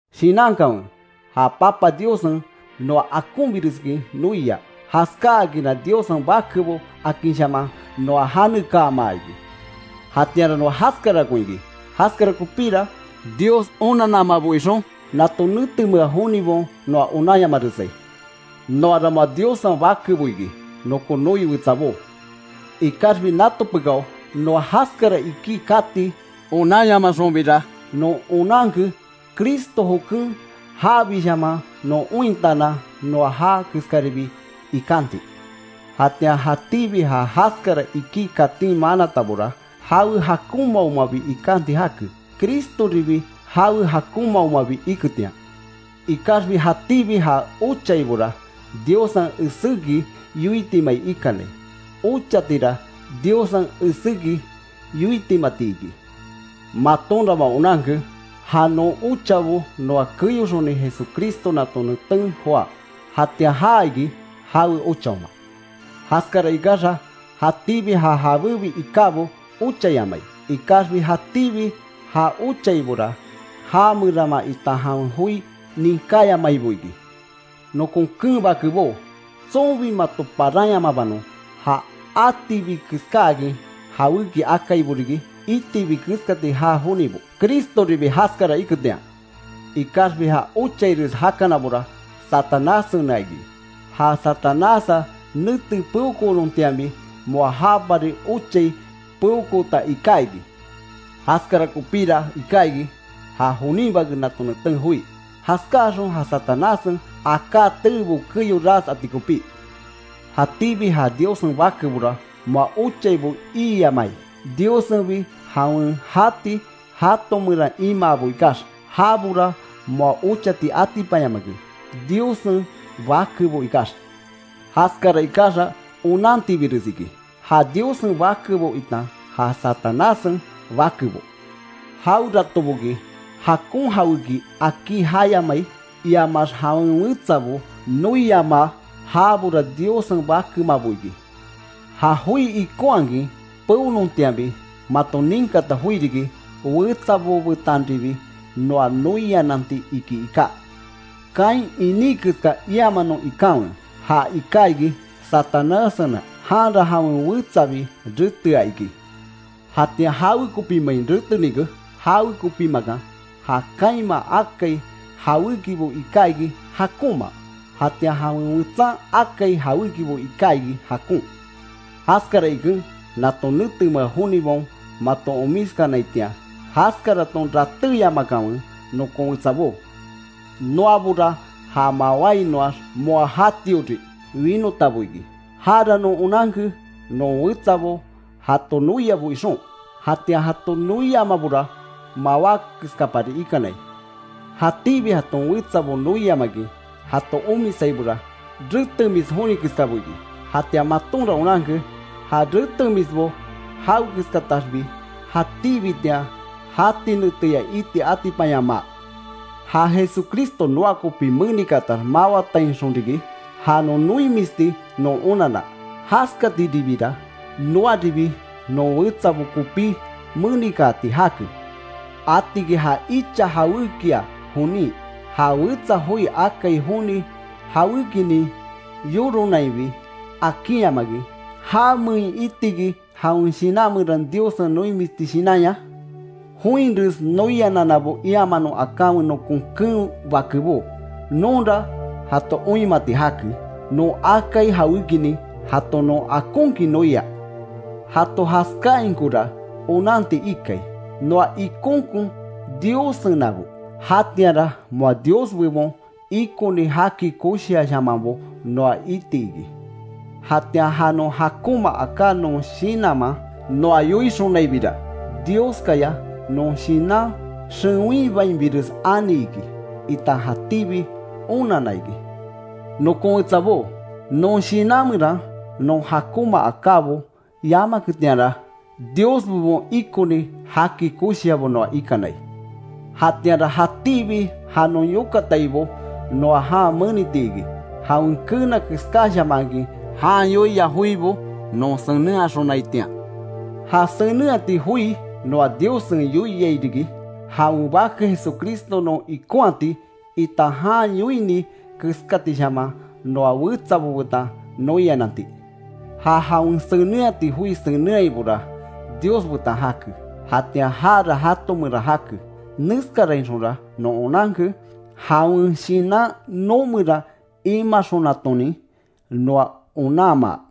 Shinankanwe, ja Papa Diossen noa akonbireskin noia, jaskákinra Diossen bakebo akinshaman noa janekaama iki. Jatianra noa jaskarakon iki. Jaskara kopíra, Dios onannamabo ixon, nato netemea jonibaon noa onanyamaresai. Noara moa Diossen bakebo iki, nokon noi wetsabó. Ikaxbi nato pekáo noa jaskara iki kati onanyamaxonbira, non onanke, Cristo joken jabishaman ointaanan, noa já keskaribi ikanti. Jatian jatíbi ja jaskara iki katin manatabora, jawe jakonmaomabi ikanti jake, Cristoribi jawe jakonmaomabi iketian. Ikaxbi jatíbi ja ochaibora, Diossen eséki yoitimai ikanai. Ochatira Diossen eséki yoitimati iki. Matonra moa onanke, ja non ochabo noa keyoxoni Jesucristo nato neten joá. Jatian já iki, jawe ochaoma. Jaskara ikaxa, jatíbi ja jabébi ikábo ochayamai. Ikaxbi, jatíbi ja ochaibora, já meraama itan jawen joi ninkáyamaibo iki. Nokon keen bakebó, tsonbi mato paranyamabanon: Ja atibi keskáakin jawéki akaibo riki, itibi keskati jaa jonibo, Cristoribi jaskara iketian. Ikaxbi ja ochaires jakanabora, Satanássena iki. Ja Satanássa nete peokoonontianbi, moa jápari ochai peokoota iká iki. Jaskara kopíra iká iki, ja jonin Bake nato neten joí, jaskáaxon ja Satanássen aká teebo keyo ras ati kopí. Jatíbi ja Diossen bakebora moa ochaibo iiyamai, Diossenbi jawen jati jato meran imaabo ikax. Jabora moa ochati atipanyamake, Diossen bakebo ikax. Jaskara ikaxa, onantibires iki, ja Diossen bakebo itan ja Satanássen bakebo. Jaweratoboki jakon jawéki akí jayamai, iamax jawen wetsabo noiamaa, jabora Diossen bakemabo iki. Ja joi ikonhakin peonontianbi, maton ninkata joi riki: wetsabo betanribi noa noiananti iki, iká. Caín iní keska iamanon ikanwe, ja iká iki Satanássena, janra jawen wetsabi retea iki. Jatian ¿Jawekopimein retenike? Jawekopimakan, ja Caínman akai jawékibo iká iki jakonma, jatian jawen wetsan akai jawékibo iká iki jakon. Jaskara iken, nato netemea jonibaon mato omiskanaitian, jaskaraton ratéyamakanwe, nokon wetsabó. Noabora, ja mawáinoax moa jatiori winotabo iki. Jara non onanke non wetsabo, jato noiabo ixon. Jatian jato noiamabora, mawá keskapari ikanai. Jatíbi jaton wetsabo noiamakin jato omisaibora, retemis joni keskabo iki. Jatian matonra onanke, ja retemisbo jawekeskataxbi jatíbitian jati neteya iti atipanyamaa. Ja Jesucristo noa kopí menikaatax mawatainxon riki, ja noimisti non onanna. Jaskatiribira, noaribi non wetsabo kopí menikaati jake. Atiki ja icha jawékia jonin, ja wetsa joi akai joni jawékinin yoronainbi, akinhamakin ¿Jamein itiki, jawen shinan meran Diossen noimisti shinanya? Joinres noianannabo iamanon akanwe, nokon keen bakebó. Nonra jato oinmati jake, non akai jawékinin, jato non akonkin noia. Jato jaskáainkora onanti ikai, noa ikonkon Diossenabo. Jatianra moa Dios bebon, ikoni jaki koshiashamanbo noa iti iki. Jatian ja non jakonma aká non shinanman noa yoixonaibira, Dioskaya non shinan xewinbainbires ani iki, itan jatíbi onanna iki. Nokon wetsabó, non shinan meran non jakonma akábo yamaketianra, Dios bebon ikoni jaki koshiabo noa ikanai. Jatianra jatíbi ja non yokataibo noa jan meniti iki, jawen keena keskáshamankin, jan yoia joibo non senenhaxonaitian. Ja senenhati joi noa Diossen yoiai riki: Jawen Bake Jesucristo non ikonhati, itan jan yoini keskatishaman noa wetsabo betan noiananti. Ja jawen senenhati joi senenhaibora, Dios betan jake. Jatian jara jato meran jake. Neskarainxonra non onanke, jawen Shinan noo meran imaxonatonin, noa onanmaa.